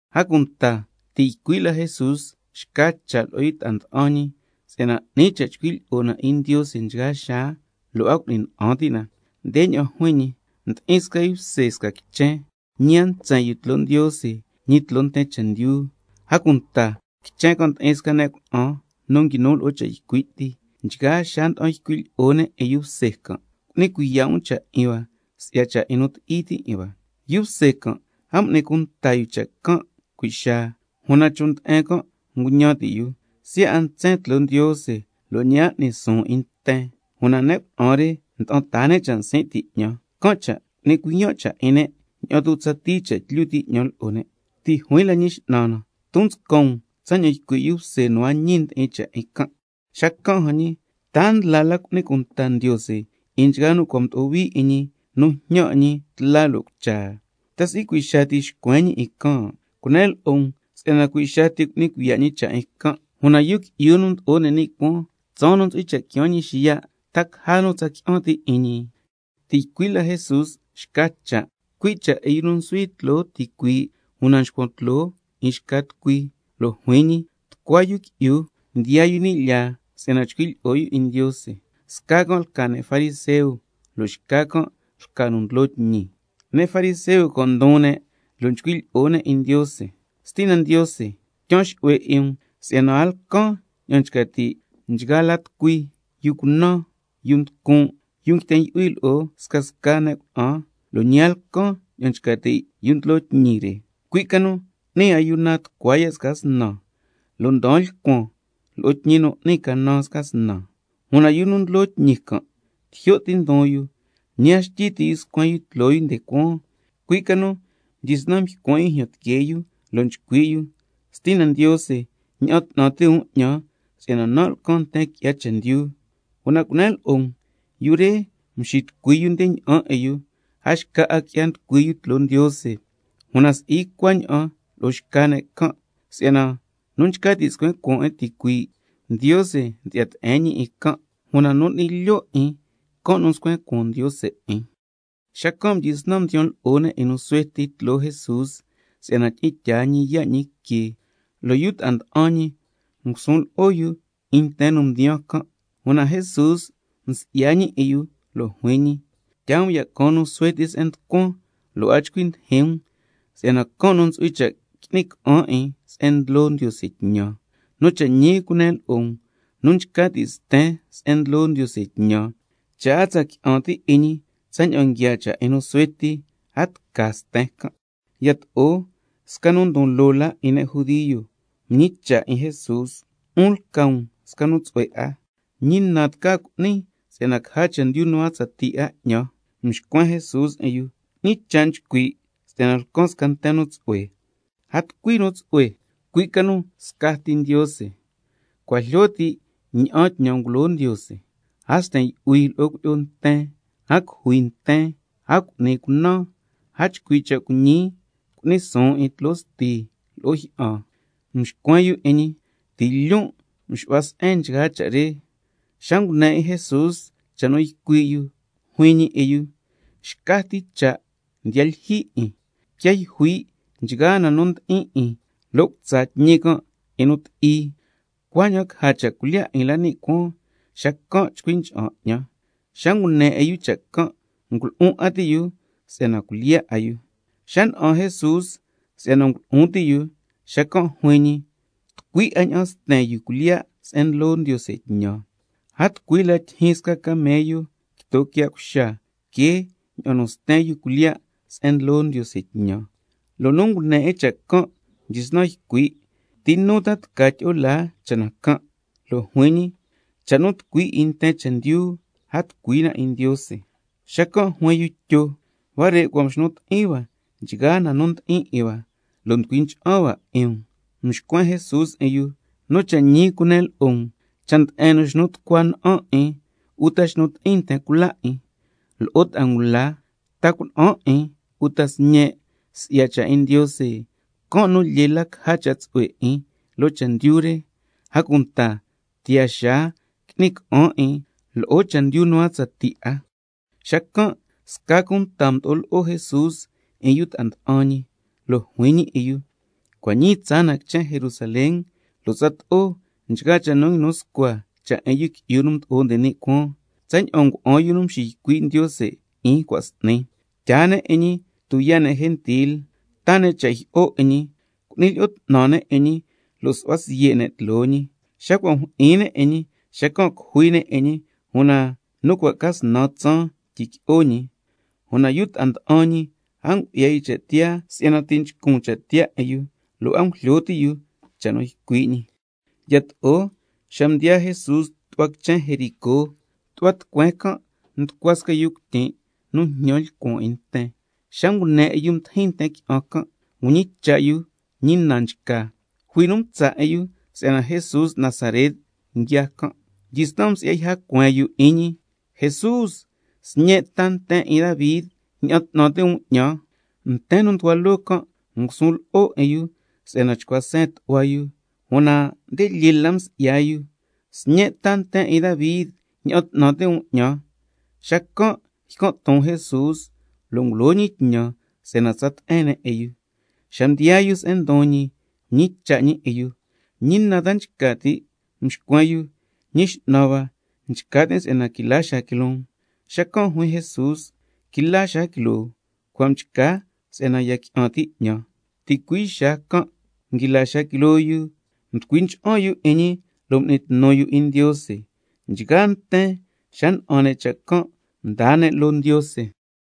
A cunta ti' ycui' la Jesús xca cha' lo'o yu ta'a nda'an ñi si'yana 'ni cha' chcui' lyi'o na 'in Ndiose nchgaa xaa, lo' a cu'ni na'an ti' na. Ndeña'an juin ñi: Ndi'in sca yu bse sca quichen, ñi a ntsen yu tloo Ndiose, ñi tloo nten chendyu. A cunta quichen can' ndi'in sca ne' cuna'an nu nguinu lo'o cha' ycui' ti, nchgaa xaa nda'an ycui' ne' lo'o yu bse can': Cu'ni cuiya' um cha' 'in hua si'ya cha' 'in nu ti'i ti' 'in hua. Yu bse can' a m'ni cunta yu cha' can' cui' xaa, una chon' nde'en can' nguñan ti' yu: Siya' a ntsen tloo Ndiose lo' ñi a n'ni suun 'in nten, una ne' cuna'an re nda'an taa ne' cha' nsin' ti' 'ñan, can' cha' cu'ni cuiyan' cha' 'in ne', ña'an tu' tsatii cha' tlyu ti' 'ñan lo'o ne'. Ti' juin la Ñi X'nan na: Ton nscan um tsaña'an ycui' yu bse nu a ñi ndi'in cha' 'in can'. Xacan' jan ñi, ¿ta a ndla la cu'ni cunta Ndiose 'in nchgaa nu cua' mdo'o hui 'in ñi nu njñan 'in ñi tla lo' cucha? ¿Ta si'i cui' xaa ti xcuen ñi 'in can'? Cunen lo'o um si'yana cui' xaa ti cu'ni cuiya' ñi cha' 'in can'. Una Yu Qui'yu nu Mdo'o nde ni' Cuaan, tsaan nu ntsu'hui cha' quiaan ñi xiya', ¿ta caja nu tsa qui'an ti' 'in ñi? Ti' ycui' la Jesús xca cha', cui' cha' 'in nu nsuhui tloo ticuii' una nxcuan tloo 'in xca tucui, lo' juin ñi: Tucua yu qui'yu mdiyaa yu ni' lyaa si'yana chcui' lyi'o yu 'in Ndiose, sca can' lca ne' fariseo, lo' xca can' lca nu ndlo tñi. Ne' fariseo can' ndon ne' lo' nchcui' lyi'o ne' 'in Ndiose: Stina Ndiose, tyaan xu'hue 'in um si'yana a lcan ña'an nchca ti' nchgaa la tucui, yu cunan, yu nducun', yu nguiten yu'hui lo'o scasca ne' cuna'an, lo' ñi a lcan ña'an nchca ti' yu nu ndlo tñi re, cui' ca nu n'nin ayuna tucua ya' sca snan, lo' ndaan lcuan loo tñi nu n'nin canan sca snan. Una yu nu ndlo tñi can' tijyo' ti ndon yu, ñi a xtyi ti' yu scuen yu tloo yu nde cuaan, cui' ca nu mdyisnan nycuan' yu jyan tiquee yu lo' nchcui' yu: Stina Ndiose, ña'an 'tnan ti' um 'ñan si'yana nan' lcan nten qui'ya chendyu. Una cunen lo'o um, yu re mxitucui yu nde ña'an 'in yu, a xca 'a qui'ya nducui yu tloo Ndiose, una si'i cuaña'an lo'o xca ne' can'. Si'yana nu nchca ti' scuen cuaan 'in ticuii', Ndiose ndyi'ya te'en ñi 'in can', una nu n'ni lyo' 'in, can' nu scuen cuaan Ndiose 'in. Xacan' mdyisnan mdiyan lo'o ne' 'in nu suhue ti tloo Jesús si'yana tyi'in tyaa ñi yaa' ñi que, lo' yu ta'a nda'an ñi ngusun lo'o yu 'in nten nu ndiyaa can'. Una Jesús msi'ya ñi 'in yu lo' juin ñi: Tyaa um ya' caan nu suhue ti se'en nducuan, lo' a chcui ndijin um, si'yana can' nu ntsu'hui cha' qui'ni ca'an 'in se'en ndlo Ndiose tñan. Nu cha' ñi cunen lo'o um, nu nchca ti' sten se'en ndlo Ndiose tñan, cha' a tsa qui'an ti' 'in ñi tsaña'an nguiaa cha' 'in nu suhue ti, a tca sten can'. Yato'o sca nu ndon loo la 'in ne' judio mñicha' 'in Jesús: 'Un lca um sca nu tsu'hue 'a, ¿ñi na tca cu'nin si'yana caja chendyu nu a tsatii 'a 'ñan? Mxcuen Jesús 'in yu: ¿Ñi cha' nchcui' si'yana lcan sca nten nu tsu'hue? A tucui nu tsu'hue, cui' ca nu scati Ndiose. Cua' jlyo ti' ña'an tñan ngulo Ndiose: —A sten yu'hui lo'o cuilyi'o nten, a cujui nten, a cu'ni cunan, a chcui' cha' cuiñi, cu'ni suun 'in tloo sti lo'o jyi'an—. Mxcuen yu 'in ñi: Ti' lyon' nxu'huan se'en nchgaa cha' re. Xa ngune 'in Jesús cha' nu ycui' yu, juin ñi 'in yu: Xca ti cha' ya lyijyi 'in. Quiaa yjui' nchgaa na nu ndi'in 'in lo' cutsa tñi can' 'in nu ti'i, cuaña'an caja cha' cuilyiya' 'in la ni' cuaan, xacan' chcui ncha'an 'ñan. Xa ngune 'in yu cha' can', ngulu'un 'a ti' yu si'yana cuilyiya' 'a yu. Xa na'an Jesús si'yana ngulu'un ti' yu, xacan' juin ñi: Tucui 'a ña'an sten ne' cuilyiya' se'en ndlo Ndiose tñan. A tucui la tyijyin sca camello quito quiya' cuxa que ña'an nu sten ne' cuilyiya' se'en ndlo Ndiose tñan. Lo' nu ngune 'in cha' can' mdyisnan ycui': ¿Ti nu tca tyi'o laa cha' na can'? Xacan' juin ñi: Cha' nu tucui 'in nten chendyu, a tucui na 'in Ndiose. Xacan' juin yu Tyo: Huare' cua' mxnu ti'in hua nchgaa na nu ndi'in 'in hua, lo' nducui ncha'an hua 'in um. Mxcuen Jesús 'in yu: Nu cha' ñi cunen lo'o um, cha' nde'en nu xnu tucua na'an 'in, uta xnu ti'in nten cula 'in, lo'o ta'a ngula, ta cuna'an 'in uta sñe', si'ya cha' 'in Ndiose, can' nu lyee la caja cha' tsu'hue 'in loo chendyu re, a cunta tiyaa xaa qui'ni ca'an 'in lo'o chendyu nu a tsatii 'a. Xacan' sca cunta mdo'o lo'o Jesús 'in yu ta'a nda'an ñi, lo' juin ñi 'in yu: Cua' ñii tsaa na Jerusalén, lo' tsato'o nchgaa cha' nu nguinu scua cha' 'in Yu Qui'yu nu Mdo'o nde ni' Cuaan, tsaña'an ngua'an yu nu mxiycui' Ndiose 'in cua' s'ni. Tyaa ne' 'in ñi tuyaa' ne' gentil, taa ne' cha' jyi'o 'in ñi, cu'ni lyi'o 'tnan ne' lo' su'hua siye' ne' tloo ñi. Xa cua' mjyi'in ne' 'in ñi, xacan' cujui ne' 'in ñi, una xa cua' ca snan tsaan tyiqui'o ñi. Una yu ta'a nda'an ñi a ngu'ya yu cha' tiyaa si'yana ti' nchcun cha' tiyaa 'in yu, can' cha' a ngujlyo ti' yu cha' nu ycui' ñi. Yato'o xa mdiyaa Jesús tu'hua quichen Jericó, tu'hua tucueen can' nducua sca yu cuityin' nu njñan lcuan 'in nten, xa ngune 'in yu ndijin nten qui'an can', mñicha' yu cha' ñi na nchca. Jui nu mtsa' 'in yu si'yana Jesús Nazaret nguiaa can'. Xacan' mdyisnan msi'ya cueen yu 'in ñi: Jesús, Sñe' ta nten 'in Davi, ña'an 'tnan ti' um 'ñan. Nten nu nducua loo can' ngusun lo'o 'in yu si'yana chcua seen tu'hua yu, una nde lyee la msi'ya yu: Sñe' ta nten 'in Davi, ña'an 'tnan ti' um 'ñan. Xacan' ycan' ton Jesús, lo' ngulo ñi tñan si'yana tsa te'en ne' 'in yu. Xa mdiyaa yu se'en ndon ñi, mñicha' ñi 'in yu: ¿Ñi na ta nchca ti' cu'nin lo'o? Mxcuen yu xacan': Ñi X'nan hua, nchca tin' si'yana quila xaa quiloon. Xacan' juin Jesús: Quila xaa quiloo, cua' mchca si'yana ya qui'an ti' 'ñan. Ticui' xaa can' nguila xaa quiloo yu, lo' mducui ncha'an yu 'in ñi, m'ni tnu yu 'in Ndiose. Nchgaa nten xa na'an ne' cha' can' mdaa ne' loo Ndiose.